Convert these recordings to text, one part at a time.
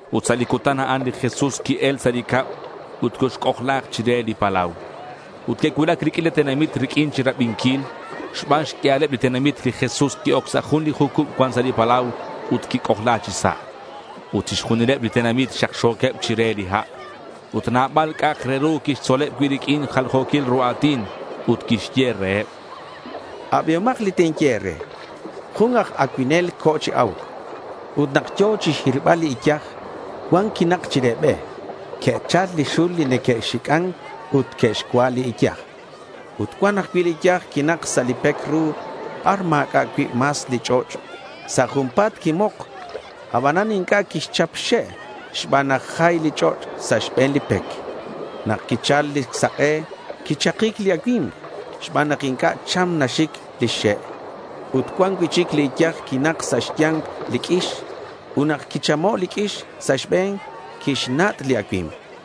Ut sa' li cutan a'an, li Jesús qui-el sa' li cab ut coxc'ojla̱k chire li palau. Ut que'cuulac li q'uila tenamit riq'uin chirabinquil. Xban xq'uialeb li tenamit, li Jesús qui-oc sa' jun li jucub cuan sa' li palau ut quic'ojla chi sa'. Ut chixjunileb li tenamit xakxo̱queb chire li ha'. Ut nabal c'a'ak re ru quixtzoleb cui' riq'uin jaljo̱quil ru a̱tin, ut quixye reheb: —Abihomak li tinye e̱re. Jun aj acuinel co̱ chi a̱uc. Ut nak yo̱ chixhirbal li iyaj, cuan quinak chire be. Que'chal li xul li neque'xic'an ut que'xcua' li iyaj. Ut cuan ajcui' li iyaj quinak sa' li pec ru bar ma̱c'a' cui' mas li ch'och'. Sa' junpa̱t quimok, abanan inc'a' quixchap xxe' xban nak jay li ch'och' sa' xbe̱n li pec. Nak quichal li sak'e quichakic li acui̱mk xban nak inc'a' cham naxic lix xe'. Ut cuan cui'chic li iyaj quinak sa' xya̱nk li q'uix. Ut nak quichamo' li q'uix sa' xbe̱n, quixnat' li acui̱mk.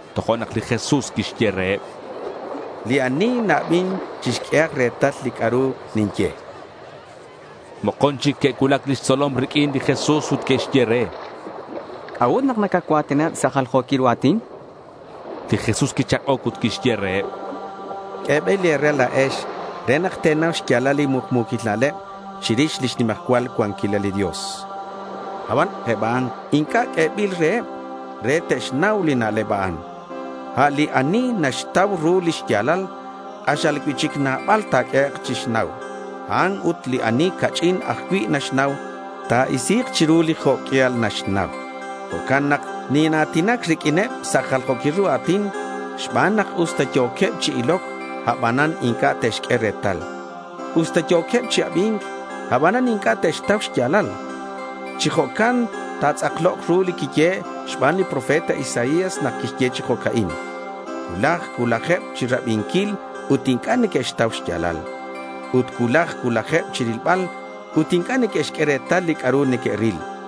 Tojo'nak li Jesús quixye reheb: —Li ani na-abin, chixq'uehak retal li c'a'ru ninye, chan. Mokon chic que'cuulac lix tzolom riq'uin li Jesús, ut que'xye re: —¿C'a'ut nak nacacua̱tinaheb sa' jaljo̱quil ru a̱tin?— Li Jesús quichak'oc ut quixye reheb: —Q'uebil e̱re la̱ex re nak te̱nau xya̱lal li mukmu̱quil na'leb chirix lix nimajcual cuanquilal li Dios. Aban eb a'an inc'a' q'uebil reheb re te'xnau li na'leb a'an. A' li ani naxtau ru li xya̱lal, k'axal cui'chic nabal ta̱q'uehek' chixnau; a'ut li ani ca'ch'in ajcui' naxnau, ta̱isi̱k chiru li jo' q'uial naxnau. Jo'can nak nina̱tinac riq'uineb sa' jaljo̱quil ru a̱tin xban nak usta yo̱queb chi iloc, abanan inc'a' te'xq'ue retal. Usta yo̱queb chi abi̱nc, abanan inc'a' te'xtau xya̱lal. Chi jo'can natz'akloc ru li quiyehe' xban li profeta Isaías nak quixye chi jo'ca'in: Cuulaj cuulajeb chirabinquil ut inc'a' neque'xtau xya̱lal. Ut cuulaj cuulajeb chirilbal ut inc'a' neque'xq'ue retal li c'a'ru neque'ril.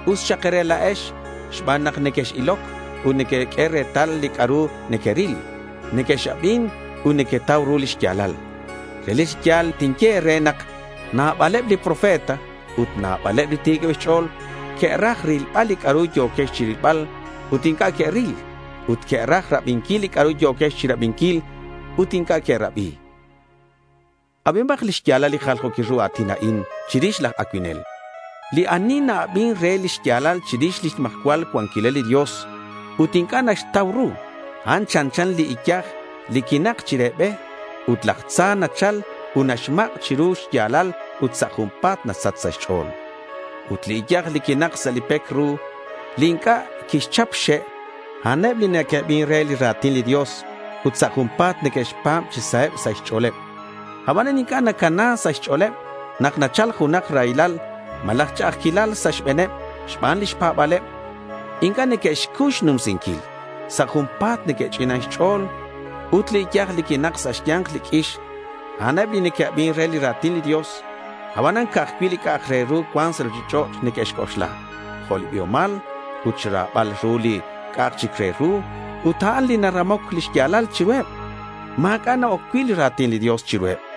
Us xak e̱re la̱ex xban nak nequex-iloc ut nequeq'ue retal li c'a'ru nequeril. Nequex-abin ut nequetau ru lix ya̱lal. Relic chi ya̱l tinye e̱re nak nabaleb li profeta ut nabaleb li ti̱queb xch'o̱l que'raj rilbal li c'a'ru yo̱quex chirilbal ut inc'a' que'ril. Ut que'raj rabinquil li c'a'ru yo̱quex chirabinquil ut inc'a' que'rabi. Abihomak lix ya̱lal li jaljo̱quil ru a̱tin a'in chirix laj acuinel. Li ani na-abin re li xya̱lal chirix lix nimajcual cuanquilal li Dios ut inc'a' naxtau ru, a'an chanchan li iyaj li quinak chire be. Ut laj tza nachal ut naxmak' chiru li xya̱lal ut sa' junpa̱t nasach sa' xch'o̱l. Ut li iyaj li quinak sa' li pec ru li inc'a' quixchap xxe', a'aneb li neque'abin re li ra̱tin li Dios ut sa' junpa̱t neque'xpa̱b chi saheb sa' xch'o̱leb. Abanan inc'a' nacana sa' xch'o̱leb. Nak nachal junak raylal, malaj ch'a'ajquilal sa' xbe̱neb xban lix pa̱ba̱leb, inc'a' neque'xcuy xnumsinquil. Sa' junpa̱t neque'ch'inan xch'o̱l. Ut li iyaj li quinak sa' xya̱nk li q'uix, a'aneb li neque'abin re li ra̱tin li Dios. Abanan ca'aj cui' li c'a'ak re ru cuan sa' ruchich'och' neque'xc'oxla, jo' li biomal ut xra̱bal ru li c'a'ak chic re ru. Ut a'an li naramoc lix ya̱lal chiruheb. Ma̱c'a' na-oc cui' li ra̱tin li Dios chiruheb.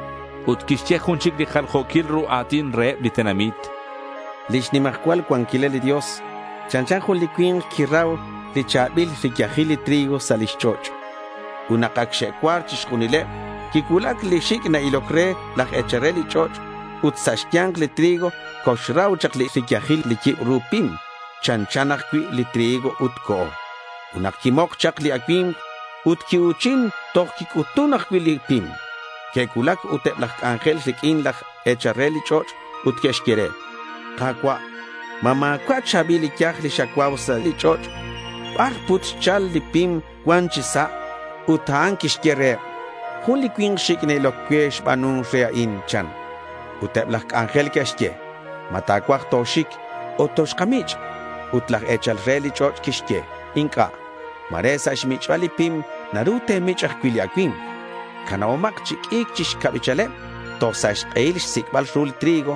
Ut quixye jun chic li jaljo̱quil ru a̱tin reheb li tenamit: Lix nimajcual cuanquilal li Dios chanchan jun li cui̱nk quirau li cha̱bil riyajil li trigo sa' lix ch'och'. Ut nak ac xe'cuar chixjunileb, quicuulac li xic' na-iloc re laj e̱chal re li ch'och' ut sa' xya̱nk li trigo coxrau chak li riyajil li yibru pim chanchan ajcui' li trigo ut co̱. Ut nak quimok chak li acui̱mk ut quiu̱chin, tojo'nak quic'utun ajcui' li pim. Que'cuulac ut eb laj c'anjel riq'uin laj e̱chal re li ch'och' ut que'xye: —Ka̱cua', ¿ma ma̱cua' cha̱bil iyaj li xacuau sa' li ch'och'? ¿Bar put xchal li pim cuan chi sa'?— Ut a'an quixye reheb: —Jun li cui̱nk xic' na-iloc cue xba̱nun re a'in, chan. Ut eb laj c'anjel que'xye: —¿Ma ta̱cuaj toxic ut toxkamich'?— Ut laj e̱chal re li ch'och' quixye: —Inc'a'. Ma̱re sa' xmich'bal li pim naru te̱mich' ajcui' li acui̱mk. Canabomak chi q'ui̱c chi xcabichaleb toj sa' xk'ehil xsic'bal ru li trigo.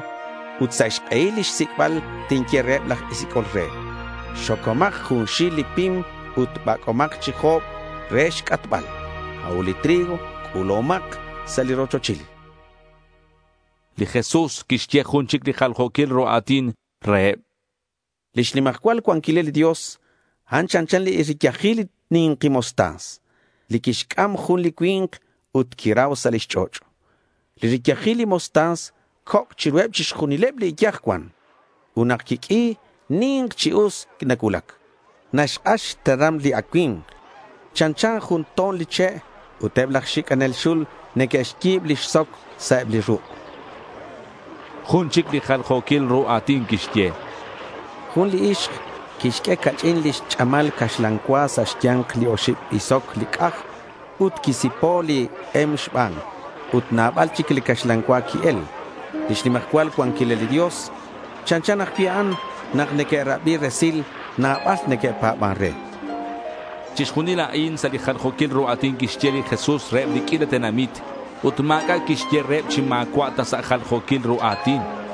Ut sa' xk'ehil li xsic'bal, tinye reheb laj sic'ol re: —Xocomak junxil li pim ut bac'omak chi jo̱b re xc'atbal. A'ut li trigo c'u̱lahomak sa' li rochochil.— Li Jesús quixye jun chic li jaljo̱quil ru a̱tin reheb: Lix nimajcual cuanquilal li Dios, a'an chanchan li riyajil li ni̱nki mostaza, li quixc'am jun li cui̱nk ut quirau sa' lix ch'och'. Li riyajil li mostaza coc' chiruheb chixjunil li iyaj cuan. Ut nak naq'ui, ni̱nk chi us nacuulac. Naxk'ax xteram li acui̱mk. Chanchan jun to̱n li che' ut eb laj xic'anel xul neque'xyi̱b lix soc sa' eb li ruk'. Jun chic li jaljo̱quil ru a̱tin quixye: Jun li ixk quixq'ue ca'ch'in lix ch'amal caxlan cua sa' xya̱nk li oxib bisoc li c'aj ut quisi̱po' li k'em xban, ut nabal chic li caxlan cua qui-el. Lix nimajcual cuanquilal li Dios chanchan ajcui' a'an. Nak neque'rabi resil, nabal neque'pa̱ban re. Chixjunil a'in sa' jaljo̱quil ru a̱tin quixye li Jesús reheb li q'uila tenamit. Ut ma̱c'a' quixye reheb chi ma̱cua' ta sa' jaljo̱quil ru a̱tin.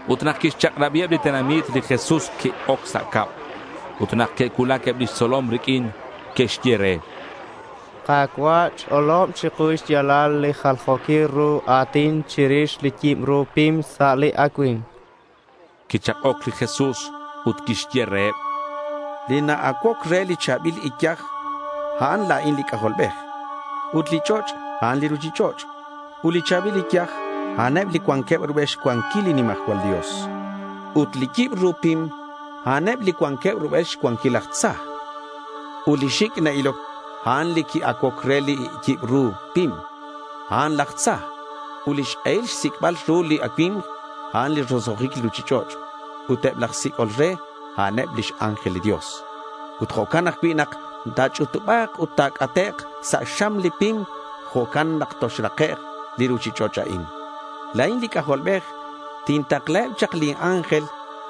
Ut nak quixchak'rabiheb li tenamit, li Jesús qui-oc sa' cab. Ut nak que'cuulac eb lix tzolom riq'uin, que'xye re: —Ka̱cua', ch'olob chiku li xya̱lal li jaljo̱quil ru a̱tin chirix li yibru pim sa' li acui̱mk, chanqueb. Quichak'oc li Jesús ut quixye reheb: —Li na-acuoc re li cha̱bil iyaj, a'an la̱in li C'ajolbej. Ut li ch'och', a'an li ruchich'och'. Ut li cha̱bil iyaj, a'aneb li cuanqueb rubel xcuanquil li nimajcual Dios. Ut li yibru pim, a'aneb li cuanqueb rubel xcuanquil laj tza. Ut li xic' na-iloc, a'an li qui-acuoc re li yibru pim. A'an laj tza. Ut lix k'ehil xsic'bal ru li acui̱mk, a'an li roso'jic li ruchich'och'. Ut eb laj sic'ol re, a'aneb lix ángel li Dios. Ut jo' ajcui' nak nach'utuba̱c ut nac'ate' sa' xam li pim, jo'can ajcui' nak toxrakek' li ruchich'och' a'in. La̱in li C'ajolbej tintaklaheb chak lin ángel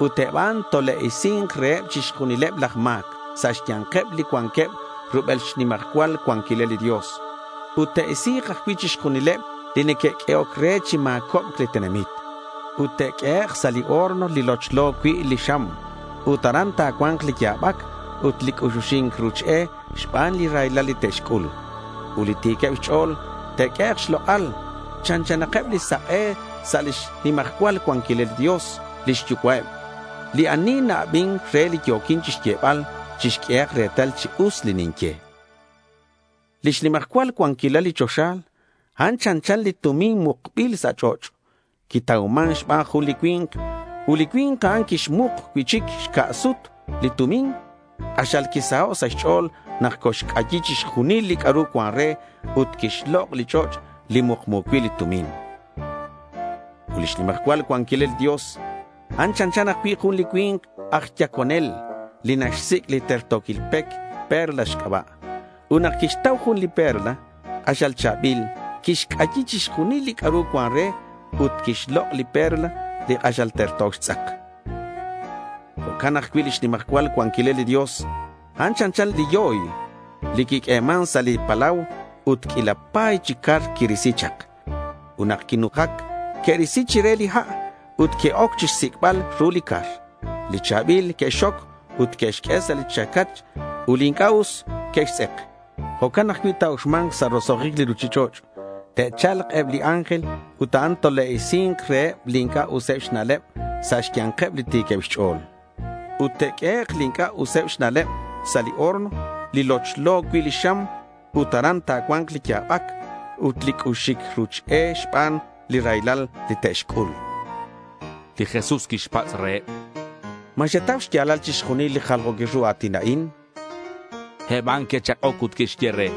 ut eb a'an tole'isi̱nk reheb chixjunileb laj ma̱c sa' xya̱nkeb li cuanqueb rubel xnimajcual cuanquilal li Dios. Ut te'isi̱k ajcui' chixjunileb li neque'q'uehoc re chi ma̱cobc li tenamit. Ut te'q'uehek' sa' li horno li lochlo cui' li xam. Ut aran ta̱cua̱nk li ya̱bac ut li c'uxuxi̱nc ruch e xban li raylal li te'xc'ul. Ut li ti̱queb xch'o̱l te'q'uehek' xlok'al. Chanchanakeb li sak'e sa' lix nimajcual cuanquilal li Dios lix Yucua'eb. Li ani na-abin re li yo̱quin chixyebal chixq'uehak retal chi us li ninye. Lix nimajcual cuanquilal li choxa, a'an chanchan li tumin mukbil sa' ch'och'. Quitauman xban jun li cui̱nk. Ut li cui̱nk a'an quixmuk cui'chic xca' sut li tumin. K'axal quisaho' sa' xch'o̱l nak coxc'ayi chixjunil li c'a'ru cuan re ut quixlok' li ch'och' li mukmu cui' li tumin. Ut lix nimajcual cuanquilal li Dios, a'an chanchan ajcui' jun li cui̱nk aj yaconel li naxsic' li terto̱quil pec perla xc'aba'. Ut nak quixtau jun li perla k'axal cha̱bil, quixc'ayi chixjunil li c'a'ru cuan re ut quixlok' li perla li k'axal terto xtz'ak. Jo'can ajcui' lix nimajcual cuanquilal li Dios, a'an chanchan li yoy li quiq'ueman sa' li palau ut q'uila pa̱y chi car quirisi chak. Ut nak quinujac, que'risi chire li ha' ut que'oc chixsic'bal ru li car. Li cha̱bil que'xxoc ut que'xq'ue sa' li chacach ut li inc'a' us que'xtz'ek. Jo'can ajcui' ta̱uxma̱nk sa' roso'jic li ruchich'och'. Te'cha̱lk eb li ángel ut a'an tole'isi̱nk reheb li inc'a' useb xna'leb sa' xya̱nkeb li ti̱queb xch'o̱l. Ut te'q'uehek' li inc'a' useb xna'leb sa' li horno li lochlo cui' li xam. Ut aran ta̱cua̱nk li ya̱bac ut li c'uxuxi̱nc ruch e xban li raylal li te'xc'ul. Li Jesús quixpatz' reheb: —¿Ma xetau xya̱lal chixjunil li jaljo̱quil ru a̱tin a'in?— Eb a'an que'chak'oc ut que'xye re: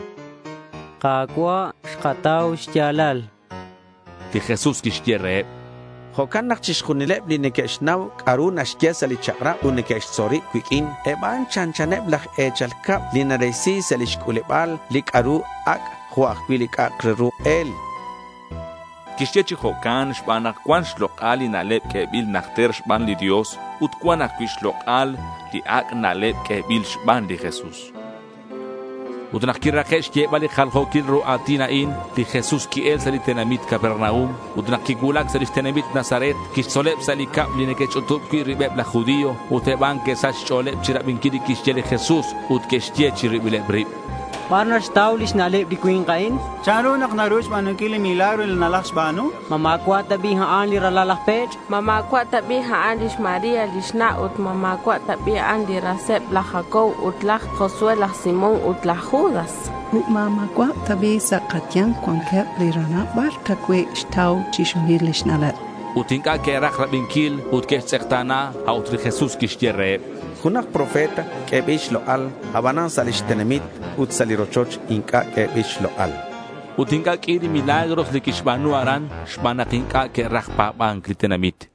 —Ka̱cua', xkatau xya̱lal, chanqueb. Li Jesús quixye reheb: —Jo'can nak chixjunileb li neque'xnau c'a'ru naxye sa' li chak'rab ut neque'xtzol rib cuiq'uin, eb a'an chanchaneb laj e̱chal cab li narisi sa' lix c'u̱leba̱l li c'a'ru ac' jo' ajcui' li c'a'ru k'el, chan li Jesús. (Quixye chi jo'can xban nak cuan xlok'al li na'leb q'uebil najter xban li Dios ut cuan ajcui' xlok'al li ac' na'leb q'uebil xban li Jesús.) Ut nak quirake' xyebal li jaljo̱quil ru a̱tin a'in, li Jesús qui-el sa' li tenamit Capernaum. Ut nak quicuulac sa' lix tenamit Nazaret, quixtzoleb sa' li cab li neque'xch'utub cui' ribeb laj judío. Ut eb a'an que'sach xch'o̱leb chirabinquil li quixye li Jesús, ut que'xye chi ribileb rib: —¿Bar naxtau lix na'leb li cui̱nk a'in? ¿Chanru nak naru xba̱nunquil li milagro a'in li nalajxba̱nu? ¿Ma ma̱cua' ta bi' a'an li ralal laj pech'? ¿Ma ma̱cua' ta bi' lix María lix na'? Ut, ¿ma ma̱cua' ta bi' a'an li raseb laj Jacobo ut laj José, laj Simón ut laj Judas? Ut, ¿ma ma̱cua' ta bi' sa' kaya̱nk cuanqueb li ranab? ¿Bar ta cui' xtau chixjunil lix na'leb? chanqueb. Ut inc'a' que'raj rabinquil ut que'xtz'ekta̱na. A' ut li Jesús quixye reheb: —Junak profeta q'uebil xlok'al. Abanan sa' lix tenamit ut sa' li rochoch inc'a' q'uebil xlok'al, chan. Ut inc'a' q'ui li milagros li quixba̱nu aran xban nak inc'a' que'raj pa̱ba̱nc li tenamit.